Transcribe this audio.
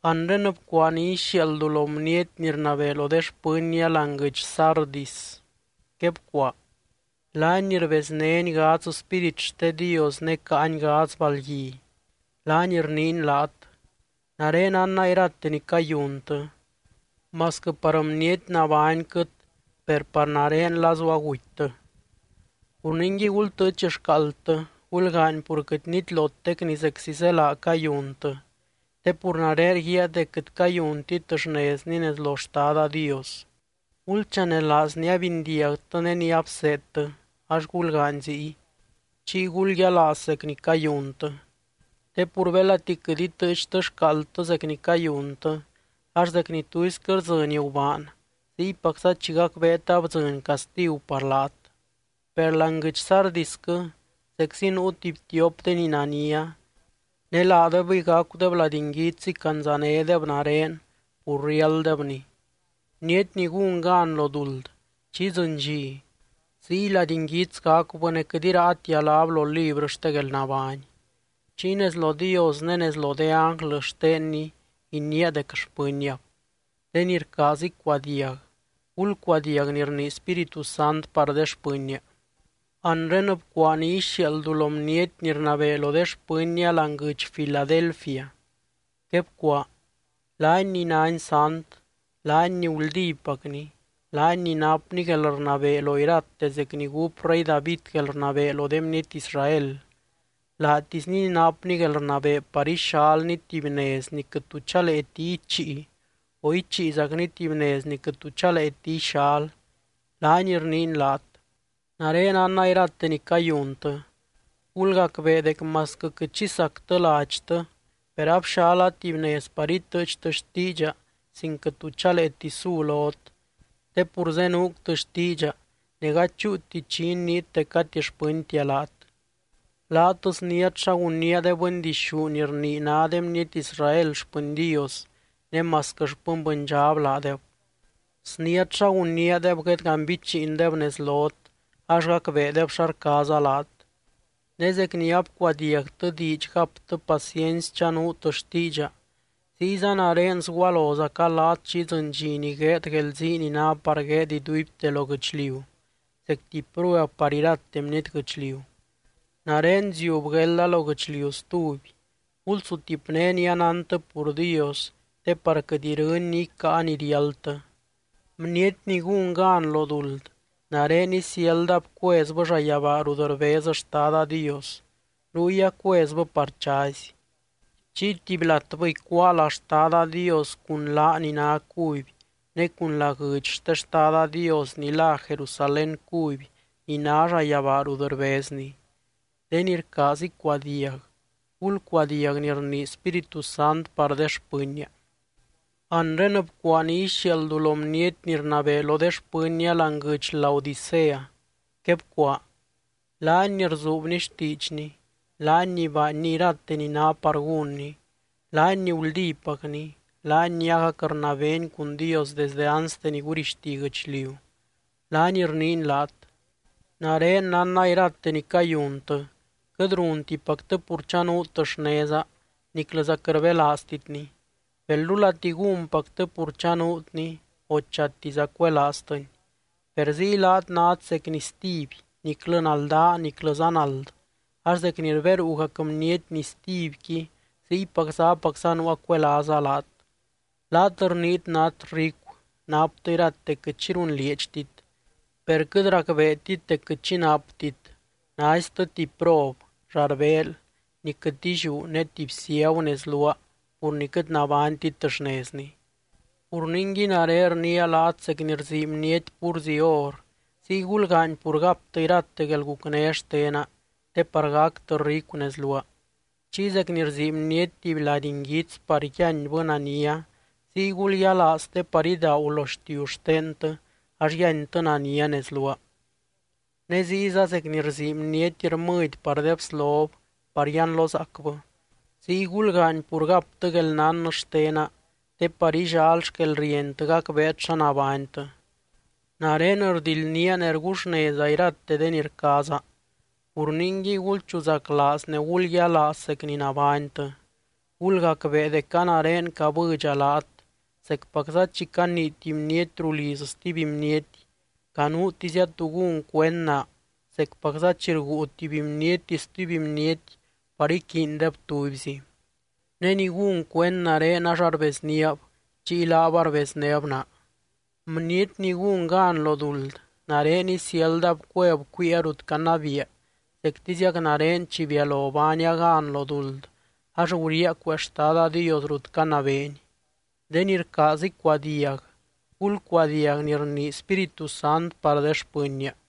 Anre bcuaa ni ixiaaldu lo bniety ni rnabee lo de xpɨnnia láani guɨdx Sardis. Quebcuaa: “Laany ni rbeznény gadz spírit xte Dios ne caany gadz balgui, laany rniiny laat: Nare nánna irate ni cayuntɨ. Masquɨ par bniety nabányquɨt, per par nare lazu agutytɨ. Pur ningui, gultɨɨch xcaaldtɨ, gulgaany pur quɨt nitlotec ni zeczi zélaa cayuntɨ, te pur nare rguíaa dec quɨt cayuntit xnezni nez lo Xtada Dios. Gulchanelaaz ni abindiagtɨ ne ni abseedtɨ, ax gulgaany ziy, chiy gulyialaaz zec ni cayuntɨ. Te pur belati quɨt itɨɨchtɨ xcaaldtɨ zec ni cayuntɨ, ax zec ni tuisquɨ rdzɨny gubaan, ziypacza chi gacbeet abdzɨny castigu par laat. Per láani guɨdx Sardisquɨ zeczi nuu tuby tiop de ni nania, ne laadebɨy gacudeb lady nguits icandzanédeb nare, pur riálddebni. Bniety ni gún gan lo duld, chi idzɨny dxi, ziy lady nguits gacubɨ ne quɨt iraatia láb lo librɨ xte guelnabány. Chiy nez lo Dios ne nez lo de ánglɨ xtenny iniia dec xpɨnniab. De ni rcaaz icuadiag, gulcuadiag ni rnii Spíritu Sant par de xpɨnnia.” ’Anre bcuaa ni ixiaaldu lo bniety ni rnabee lo de xpɨnnia láani guɨdx Filadelfia. Quebcuaa: “Laany ni nány sant, laany ni guldípacny, laany ni napny guelrnabee lo irate zec ni gúp rey David guelrnabee lo de bniety Israel, laatisny ni napny guelrnabee par ixalny tuby nez ni quɨt tu chaleeti ichii o ichiizacny tuby nez ni quɨt tu chaleeti ixal, laany rniiny laat: Nare nánna irate ni cayuntɨ. Gulgacbee dec masquɨ quɨt xi sactɨ ladxtɨ, per abxala tuby nez par itɨɨchtɨ xtiidxa sin quɨt tu chaleeti su lot, te pur zenuuctɨ xtiidxa ne gady chúuti chi iniit dec gati xpɨntia laat. Laat sniát xa gunnía de bɨndixú ni rnii ná de bniety Israel xpɨny Dios, ne masquɨ xpɨny bɨndxab laadeb. Sniát xa gunníadeb guedganbichiindeb nez lot, ax gacbeedeb xa rcaaza laat. Ne zec ni abcuadiagtɨ diidx gaptɨ paciency chanuut xtiidxa, ziyza nare sgualozaca laat chi idzɨny dxi ni gueed guelzii ni ná par gueed iduibte lo guɨchliu, zec tuby prueb par irate bniety guɨchliu. Nare ziub guelda lo guɨchliu stuby. Gulsutipné ni anántɨ pur Dios te par quɨt irɨny ni icáa ni riáldtɨ. Bniety ni gún gan lo duld, nare isiáldab cuezbɨ llayabaa rut rbez Xtada Dios, ruy acuezbɨ par chazy. Chiy tuby latbɨ icuáa lá Xtada Dios cun láa ni ná cuby, ne cun lá guɨdx xte Xtada Dios ni lá Jerusalén cuby ni ná llayabaa rut rbezny. De ni rcaaz icuadiag, gulcuadiag ni rnii Spíritu Sant par de xpɨnnia.” ’Anre bcuaa ni ixiaaldu lo bniety ni rnabee lo de xpɨnnia láani guɨdx Laodicea. Quebcuaa: “Laany ni rzuubny xtiidxny, laany ni baanny irate ni ná par gúnny, laany ni guldípacny, laany ni agac rnabeeny cun Dios desdɨ anste ni gurixti guɨchliu, laany rniiny laat: Nare nánna irate ni cayuntɨ. Quɨt runtipactɨ pur chanuut xneza, niclɨza quɨt rbelaaztitni. Belrulati gúnpactɨ pur chanuutni, o chatiza cuelaaztɨni. Per ziy laat nát zec nistiby, niclɨ naldaa niclɨza nald, ax zec ni rberuugac bniety nistibyqui ziypacza apacza nuua cuelaaza laat. Laat rniit nát ricu, naptɨ irate quɨt xi runlieedxtit. Per quɨt racbeetit dec quɨt xi naptit, naiztɨ tuby prob, llarbeel, ni quɨt illiú ne tuby ciagu nez luaa pur ni quɨt nabánytit xnezni. Pur ningui, nare rniia laat zec ni rsii bniety púrzi or, ziy gulgaany pur gaptɨ irate guelgucné xtena, te par gactɨ ricu nez luaa. Chiy zec ni rsii bniety tuby lady nguits par yíanbɨ nania, ziy gulyialaaz te par idaagu lo xtiu xtentɨ ax yíantɨ nania nez luaa. Ne ziyza zec ni rsii bniety rmɨdy par de bslob par yianlozaacbɨ, ziy gulgaany pur gaptɨ guelnán xtena te par illal xquelrientɨ gacbeet xa nabánytɨ. Nare rldildnía ne rguxneza irate de ni rcaaza. Pur ningui, gulchuzaclaaz ne gulyialaaz zec ni nabánytɨ. Gulgacbee dec a nare cabɨdxa laat, zecpacza chi canii tuby bniety ruu liz stuby bniety. Canuutizia tú gún cuend naa, zecpacza chi rguu tuby bniety stuby bniety par iquiindeb tubyzi. Ne ni gún cuend nare ax arbezníab, chiy laab arbeznéb naa. Bniety ni gún gan lo duld, nare isiáldab cueb cuiia rut canabiia zectiziac nare chi bialo baania gan lo duld, ax guriaa cuee Xtada Dios rut canabeeny. De ni rcaaz icuadiag, gulcuadiag ni rnii Spíritu Sant par de xpɨnnia.”